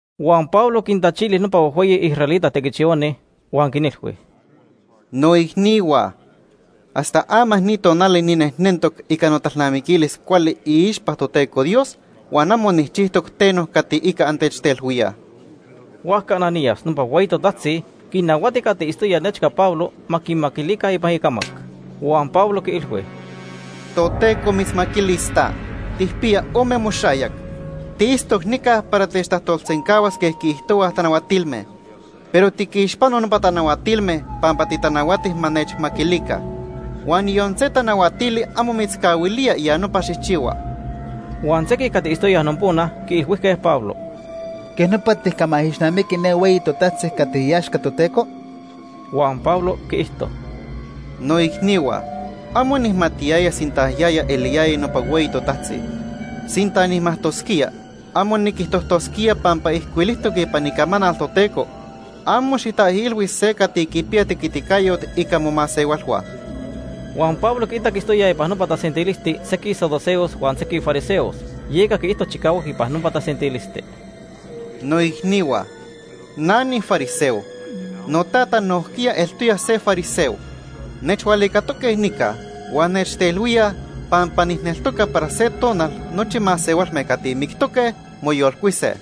Huan Pablo quintachili nopa huejhueyi israelita tequichihuani huan quinilhui: ―¡Noicnihua! Hasta ama ni tonali ninejnentoc ica notalnamiquilis cuali iixpa Toteco Dios huan amo nijchijtoc teno cati ica antechtelhuíaj. Huajca Ananías, nopa hueyi totajtzi quinnahuati cati itztoya nechca Pablo ma quimaquilica ipan icamac. Huan Pablo quiilhui: ―Toteco mitzmaquilis ta, tijpiya ome moxayac. Tiitztoc nica para techtajtolsencahuas quej quiijtohuaj tanahuatilme. Pero tiquixpano nopa tanahuatilme pampa titanahuati ma nechmaquilica. Huan yon se tanahuatili amo mitzcahuilía ya nopa xijchihua. Huan sequij cati itztoyaj nopona quiilhuijque Pablo: ―¿Quej nopa tijcamaijixnamiqui ne hueyi totajtzi cati iaxca Toteco? Huan Pablo quiijto: ―Noicnihua, amo nijmatiyaya sinta yaya eliyaya nopa hueyi totajtzi. Sinta nijmajtosquía, amo niquijtojtosquía pampa ijcuilijtoc ipan Icamanal Toteco: ‘Amo xijtaijilhui se cati quipiya tequiticayot ica momasehualhua.’ Huan Pablo quiitac itztoyaj ipan nopa tasentilisti sequij saduceos huan sequij fariseos, yeca quiijto chicahuac ipan nopa tasentilisti: ―Noicnihua, na nifariseo. Notata nojquiya eltoya se fariseo. Nechhualicatoque nica huan nechtelhuíaj pampa nijneltoca para se tonal nochi masehualme cati mictoque, moyolcuise.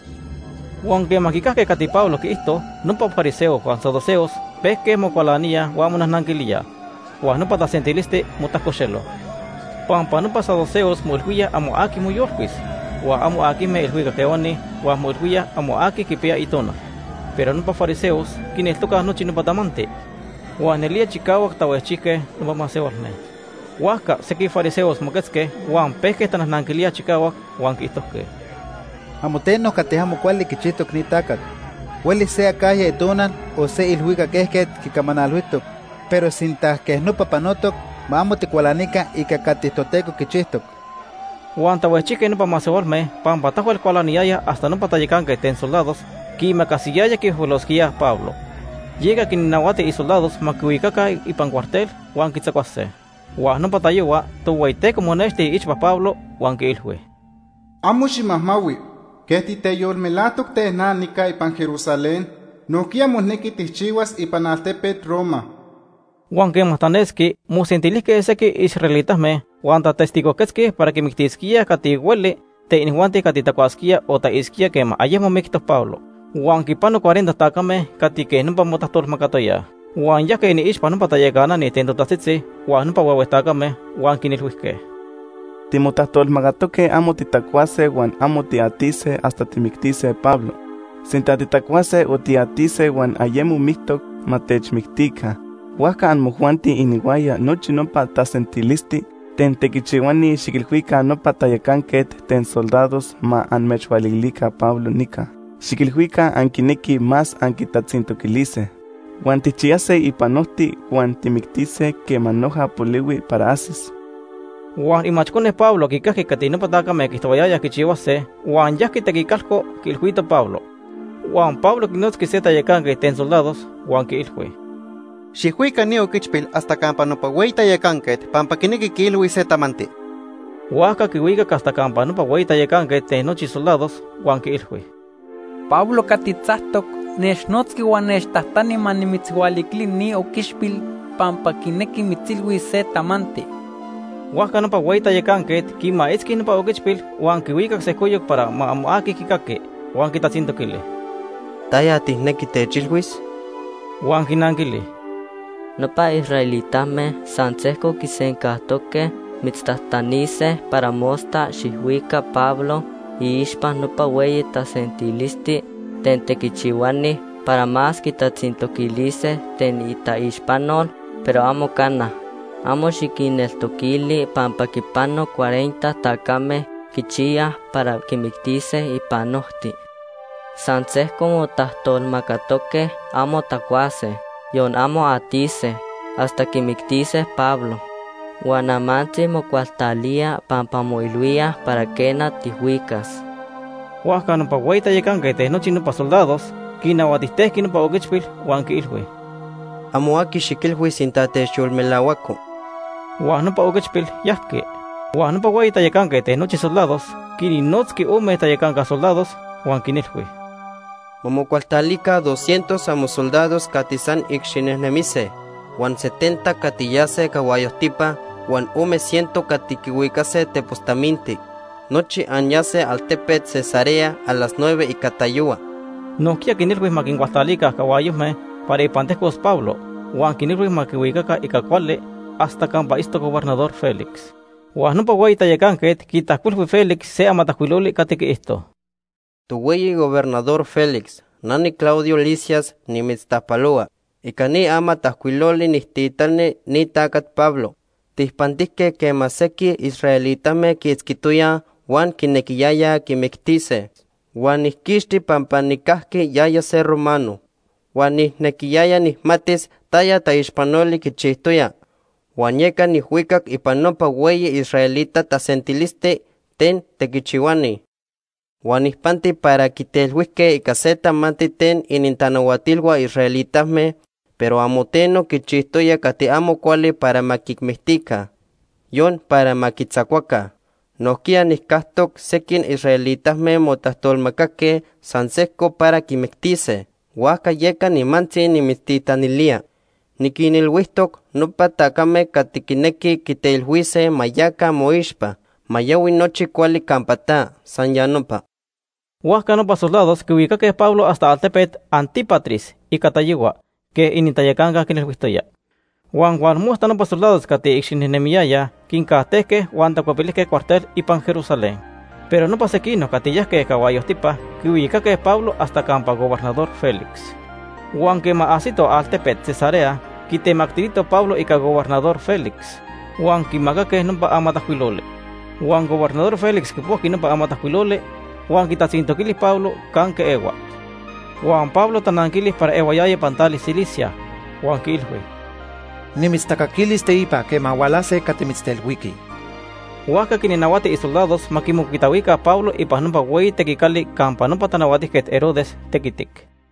Huan quema quicajque cati Pablo quiijto, nopa fariseos huan saduceos pejque mocualaníaj huan monajnanquilíaj, huan nopa tasentilisti motajcoxelo. Pampa nopa saduceos moilhuíaj amo aqui moyolcuis, huan amo aquijme ilhuicac ehuani huan moilhuíaj amo aqui quipiya itonal. Pero nopa fariseos quineltocaj nochi nopa tamanti. Huan nelía chicahuac tahuejchijque nopa masehualme. Huajca sequij fariseos moquetzque huan pejque tanajnanquilíaj chicahuac, huan quiijtojque: ―Amo teno cati amo cuali quichijtoc ni tacat. Huelis se acajya itonal o se ilhuicac ejquet quicamanalhuijtoc, pero sinta quej nopa panotoc, ma amo ticualanica ica cati Toteco quichijtoc. Huan tahuejchijque nopa masehualme pampa tahuel cualaniyayaj hasta nopa tayacanquet ten soldados quiimacasiyaya quihuejhuelosquíaj Pablo. Yeca quinnahuati isoldados ma quihuicaca ipan cuartel huan quitzacuase. Huan nopa tayohua Tohueyiteco monexti iixpa Pablo huan quiilhui: “Amo ximajmahui. Quej titeyolmelajtoc ten na nica ipan Jerusalén, nojquiya monequi tijchihuas ipan altepet Roma.” Huan quema tanesqui mosentilijque sequij israelitame huan tatestigojquetzque para quimictisquíaj cati hueli ten inijuanti cati tacuasquía o atisquía quema ayemo mictoc Pablo. Huan quipano cuarenta tacame cati quej nopa motajtolmacatoyaj. Huan yajque iniixpa nopa tayacanani ten totajtzitzi huan nopa huehue tacame huan quinilhuijque: ―Timotajtolmacatoque amo titacuase huan amo tiatise hasta tijmictise Pablo. Sinta titacuase o tiatise huan ayemo mictoc, ma techmictica. Huajca amojuanti inihuaya nochi nopa tasentilisti ten tequichihuani xiquilhuica nopa tayacanquet ten soldados ma amechhualiquilica Pablo nica. Xiquilhuica anquinequij más anquitatzintoquilise. Huan tijchiyase ipan ojti huan tijmictise quema noja polihui para ajsis. Huan imachcone Pablo quicajqui cati nopa tacame quiijtohuayayaj quichihuase huan yajqui tequicalco quiilhuito Pablo. Huan Pablo quinotzqui se tayacanquet ten soldados huan quiilhui: ―Xijhuica ni oquichpil hasta campa nopa hueyi tayacanquet pampa quinequi quiilhuis se tamanti. Huajca quihuicac hasta campa nopa hueyi tayacanquet ten nochi soldados huan quiilhui: ―Pablo cati tzactoc, nechnotzqui huan nechtajtani ma nimitzhualiquili ni oquichpil pampa quinequi mitzilhuis se tamanti. Huajca nopa hueyi tayacanquet quimaitzqui nopa oquichpil huan quihuicac sejcoyoc para amo aqui ma quicaqui huan quitatzintoquili: ―¿Taya tijnequi techilhuis? Huan quinanquili: ―Nopa israelitame san sejco quisencajtoque mitztajtanise para mosta xijhuica Pablo iixpa nopa hueyi tasentilisti ten tequichihuani para más quitatzintoquilise ten itaixpanol, pero amo cana. Amo xiquinneltoquili pampa quipano cuarenta tacame quichiyaj para quimictise ipan ojti. San sejco motajtolmacatoque amo tacuase, yon amo atise, hasta quimictise Pablo. Huan amantzi mocualtalíaj pampa moilhuíaj para quena, tijhuicas. Huajca nopa hueyi tayacanquet ten nochi nopa soldados quinahuatijtejqui nopa oquichpil huan quiilhui: ―Amo aqui xiquilhui sinta techyolmelahuaco. Huan nopa oquichpil yajqui. Huan nopa hueyi tayacanquet ten nochi soldados quinnotzqui ome tayacanca soldados huan quinilhui: ―Ma mocualtalica doscientos amosoldados cati san icxinejnemise, huan setenta cati yase cahuayojtipa huan ome ciento cati quihuicase tepos taminti. Nochi anyase altepet Cesarea a las nueve ica tayohua. Nojquiya quinilhui ma quincualtalica cahuayojme para ipan tejcos Pablo, huan quinilhui ma quihuicaca ica cuali hasta campa itztoc Gobernador Félix. Huan nopa hueyi tayacanquet quitajcuilhui Félix se amatajcuiloli cati quiijto: Tohueyi Gobernador Félix, na niClaudio Lisias nimitztajpalohua. Ica ni amatajcuiloli nijtitani ni tacat Pablo. Tijpantijque quema sequij israelitame quiitzquitoyaj huan quinequiyayaj quimictise. Huan niquinquixtili pampa nijcajqui yaya se romano. Huan nijnequiyaya nijmatis taya taixpanoli quichijtoya huan yeca nijhuicac ipan nopa hueyi israelita tasentilisti ten tequichihuani. Huan nijpanti para quitelhuijque ica se tamanti ten inintanahuatilhua israelitame, pero amo teno quichijtoya cati amo cuali para ma quimictica, yon para ma quitzacuaca. Nojquiya nijcactoc, sequij israelitame motajtolmacaque san sejco para quimictise; huajca yeca nimantzi nimitztitanilía. Niquinilhuijtoc nopa tacame cati quinequij quitelhuise ma yaca moixpa. Ma yahui nochi cuali campa ta. San ya nopa. Huajca nopa soldados quihuicaque Pablo hasta altepet Antípatris ica tayohua quej inintayacanca quinilhuijtoya. Huan tonili nopa soldados cati icxinejnemiyayaj quincajtejque huan tacuepilijque cuartel ipan Jerusalén, pero nopa sequinoc cati yajque cahuayojtipa quihuicaque Pablo hasta campa Gobernador Félix. Huan quema ajsitoj altepet Cesarea, quitemactilitoj Pablo ica Gobernador Félix, huan quimacaque nopa amatajcuiloli. Huan Gobernador Félix quipojqui nopa amatajcuiloli huan quitatzintoquili Pablo canque ehua. Huan Pablo tananquili para ehuayaya ipan tali Cilicia, huan quiilhui: ―Nimitztacaquilis teipa quema hualase cati mitztelhuiquij. Huajca quinnahuati isoldados ma quimocuitahuica Pablo ipan nopa hueyi tequicali campa nopa Tanahuatijquet Herodes tequitic.